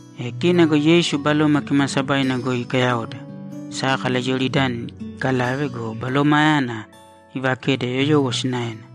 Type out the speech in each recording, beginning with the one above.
E kina go Yeisu Baloma Kimaasabaina goi ikayaoda, sákala Iyoridani ikalave go, Balomayana iivakede yoyowo sinaena.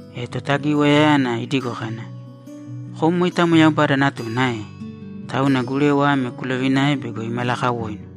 E Totagiwayayana idigo kana, ‘Kom moitamo Yaubada Natuna ae? Tauna gurewa ame kulovināe bego imalakawoinu.’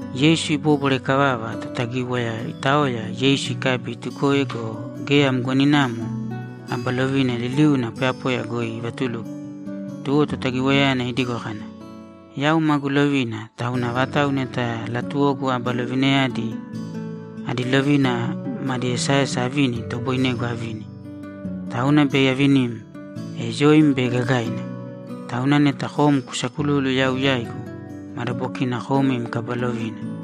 Yeisu ibóbwara ikavava, Totagíwaya itaoya, Yeisu ikabi, itukoe go, geya mgoninamo aba lovina liliuna poyapoya goi ivatuluko. Tuwo Totagiwayayana idigo kana, ‘Yau magu lovina tauna avatau neta latuwogu aba lovinayadi adi lovina madi esaesa avini, itoboinegu avini. Tauna bei avinim, e yoim bei gagaina. Tauna neta kom kusakululu yau yaigu, madabokina kom im kaba lovina.’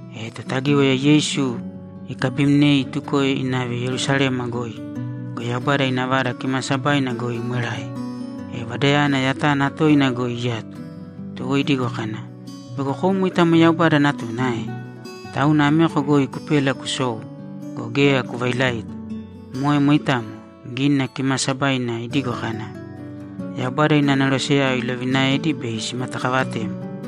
E Totagíwaya Yeisu ikabimnei itukoe inave Yerusalema goi go, Yaubada ina Vada Kimaasabaina goi imwerae, e Vadayana yatana toina goi iyato. Tuwo idigo kana, ‘Bego kom moitamo Yaubada Natuna ae? Tauna ameko goi kupēla kusōu go, geya kuvailaita. Moe moitamo. Gínina Kimaasabaina idigo kana, “Yaubada ina aneroseyao ilovinaedi bei simatakavatem.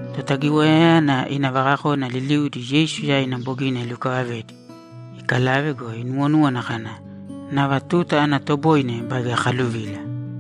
Totagiwayayana ina vakakona liliudi Yeisu yaina bogina ilukavavedi, ikalave go, inuwonúwana kana, ‘Nava tuta ana toboine baige akaluvila.’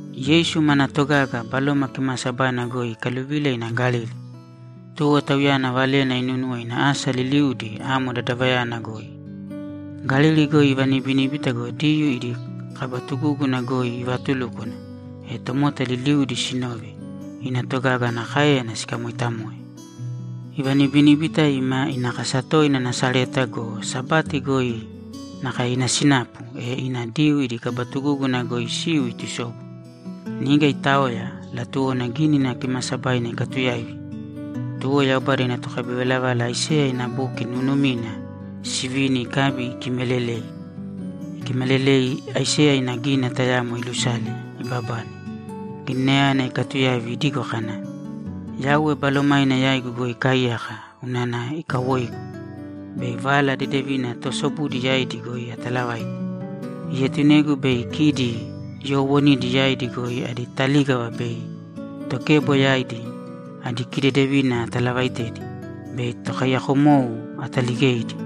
Yeisu manaa togaga Baloma Kimaasabaina goi ikaluvila ina Galili. Tuwo Tauyana valena inúnuwo ina asa liliudi amo dadavayana goi. Galili goi ivanibiníbita go, Diyuu idi kaba tugúguna goi ivaatulúkwana, e tomota liliudi sinove, ina togaga ana káeyana sikamooitamoe. Ivanibiníbita ima ina kasa toina Nasareta go, Sabati goi nakae ina sinapu, e ina Diyuu idi kaba tugúguna goi isiu itusobu. Niga itaoya, latuwona Gínina Kimaasabaina ikatuyaivi. Tuwo Yaubada ina tokabivalavala Aiseya ina buki nuunumina sivini ikabi ikimalelei. Ikimalelei, Aiseya ina gínina tayamo ilusale, ibabane. Gininayana ikatuyaivi idigo kana, ‘Yauwe Balomaina yaigu goi ikaaiyaka unana ikawoigu bei Vala Dedevina toosobudi yaidi goi atalavaite. Ietunegu bei kidi yoowonidi yaidi goi adi talígava be tokebo yaidi adi kidedevina atalavaitedi, bei tokaiyakomou ataligeidi,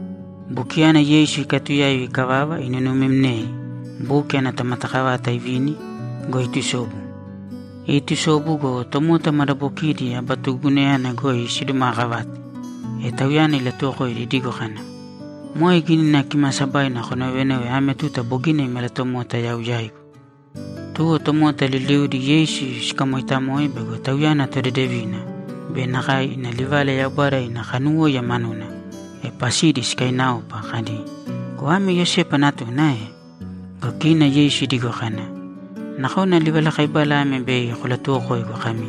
Bukiyana Yeisu ikatuyaivi ikavava, inunumimnei, buki ana tomatakavata ivini go, itusobu. Itusobu go, tomota madabokiidi aba tugugunayana goi sidumaakavate. E Tauyana ilatuwokoidi idigo kana, ‘Moe Gínina Kimaasabaina konovenove ame tuta bogina imalatomota yau yaigu.’ Tuwo tomota liliudi Yeisu sikamoitamoe bego Tauyana todedevina be nakae ina livala Yaubada ina kanuwóiya manuna, e pasidi sikainaopa kadi, ‘Go ame Iyosepa natuna ae?’ Go kina Yeisu idigo kana, ‘Nakona livalakaibala ame bei kolatuwokoigu kami,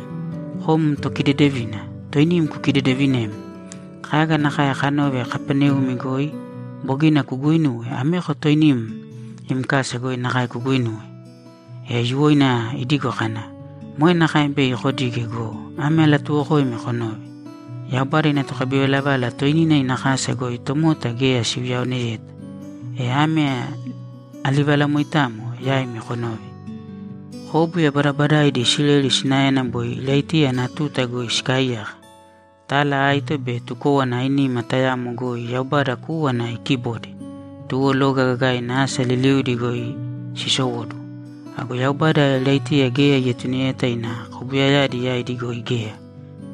“Kom tokidedevina, toinim kukidedevinēm. Kaga nakae kanove Kapaneumi goi bogina kuguuinuwe, ameko toinim im kasa goi nakae kuguinūwe.”’ E aiyuwoina idigo kana, ‘Moe nakae bei kodige go, ame alatuuwokoimi konōve: Yaubada ina tokabivalavala toinina ina kasa goi tomota geya siuyaoneyeta. E ame alivalamoitamo yaimi konōve: Kóbuya badabadaidi Isileli sinaena boi Iraitiya ana tuta goi sikaaiyaka. Tala aito be tukówana ainima tayamo goi Yaubada kúwana ikibode, tuwo loga gagaina asa liliudi goi isowóduwo. Ago Yaubada Iraitiya geya ietuneyeta ina kobuyayadi yaidi goi geya,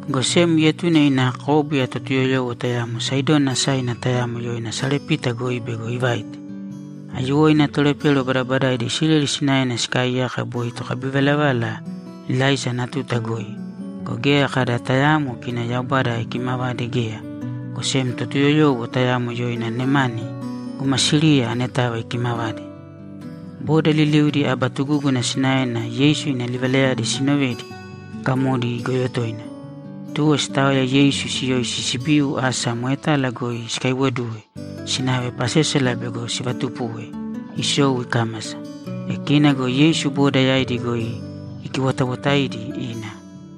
go sem ietune ina kóbuya Totuyoyowo tayamo Saidoni asaina tayamo yoina Sarepita goi bego ivaite. Aiyuwoina tolepero badabadaidi Isileli sinaena sikaaiyaka boi tokabivalavala Ilaisa ana tuta goi go, geya kada tayaamo kina Yaubada ikimavade geya, go sem Totuyoyowo tayamo yoina Nemani guma Siriya aneta ikimavade.’ Boda liliudi aba tugúguna sinaena Yeisu ina livalayadi sinovedi, gamodi igoyo toina. Tuwo sitaoya Yeisu siyoisi sibiu asa moetala goi sikaiwoduwe sinave pasésala bego sivatupuwe isou ikámasa. E kina go Yeisu boda yaidi goi ikiwotawotaidi ina.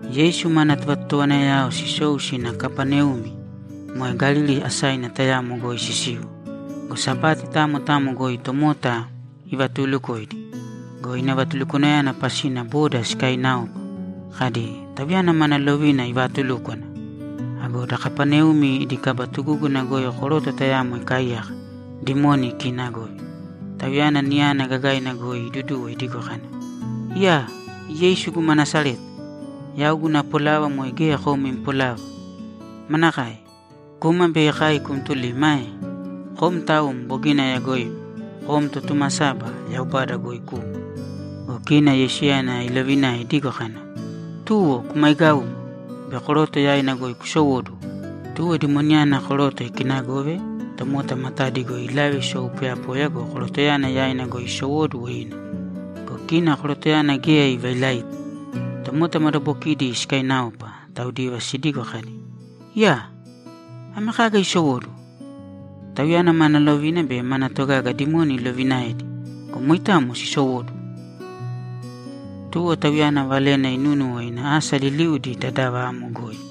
Yeisu mana tovatotowanayao sisou sina Kapaneumi, moe Galili asaina tayamo goi sisiu. Go Sabati tamo tamo goi tomota ivatuulukoidi. Go ina vatulukwanayana pasina boda sikainaopa, kadi, ‘Tauyana mana lovina ivaatulúkwana!’ Ago da Kapaneumi idi kaba tugúguna goi koroto tayamo ikaaiyaka, dimoni ikiinagove. Tauyana niyana gagaina goi iduduwo idigo kana, ‘Iyaa! Yeisu guma Nasareta, yau guna polava moe geya kom im polava. Manakae? Kuma bei kai kumtulima ae? Kom taum bogina ayagoim. Kom Totumasaba, Yaubada goi kuma.’ Go kina Yeisuyana ilovinae idigo kana, ‘Tuwo! Kumaigāumo be koroto yaina goi kusowōduwo!’ Tuwo dimoniyana koroto ikinagove, tomota matadi goi ilave isou poyapoya go, korotoyana yaina goi isowóduwo ina. Go kina korotoyana geya ivailaita. Tomota madabokidi sikainaopa, taudiva sidigo kadi, ‘Iyaa! Ame kaga isowóduwo? Tauyana mana lovina be mana togaga dimoni iloviinaedi go, moitamo sisowóduwo!’ Tuwo Tauyana valena inunúnuwo ina asa liliudi dadava amo goi.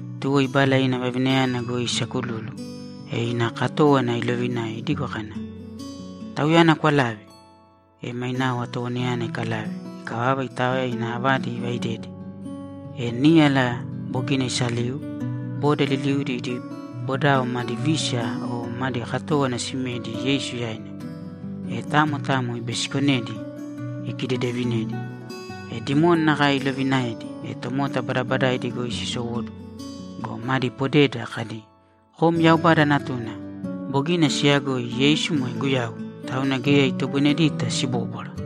Tuwo ibala ina vavinayana goi isakululu, e ina katówana ilovinae idigo kana, ‘Tauyana kwalāve.’ E mainao atowanayana ikalave. Ikavava, itaoya ina avadi ivaidede. E níyala bogina iisaliu, boda liliudi idi bodao madi vísiya o madi katówana simedi Yeisu yaina. E tamo tamo ibisikonedi, ikidedevinedi. E dimoni nakae ilovinaedi, e tomota badabadaidi goi sisowóduwo go, madi podeda kadi, ‘Kom Yaubada Natuna.’ Bogina siyagoi Yeisu moe Guyau, tauna geya itagonedita sibóbwara.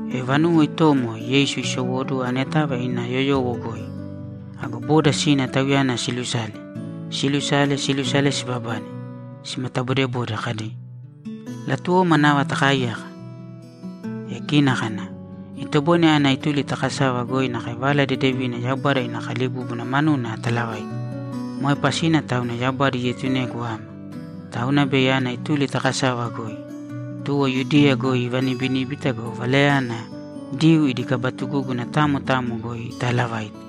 E vanuwo itomo, Yeisu isowóduwo aneta ina yoyowo goi. Ago boda sina Tauyana siilusale. Siilusale, siilusale, sibabane simatabodebode kadi, ‘Latuwoma nava takaaiyaka.’ E kina kana, ‘Itoboine ana ituli ta kasava goi nakae Vala Dedevina Yaubada ina kalibúbuna manuna atalavaite. Moe pasina tauna Yaubada ietunegu ama. Tauna bei ana ituli ta kasava goi.’ Tuwo Yudiya goi ivanibiníbita go, Valayana Diyuu idi kaba tugúguna tamo tamo goi itaalavaite.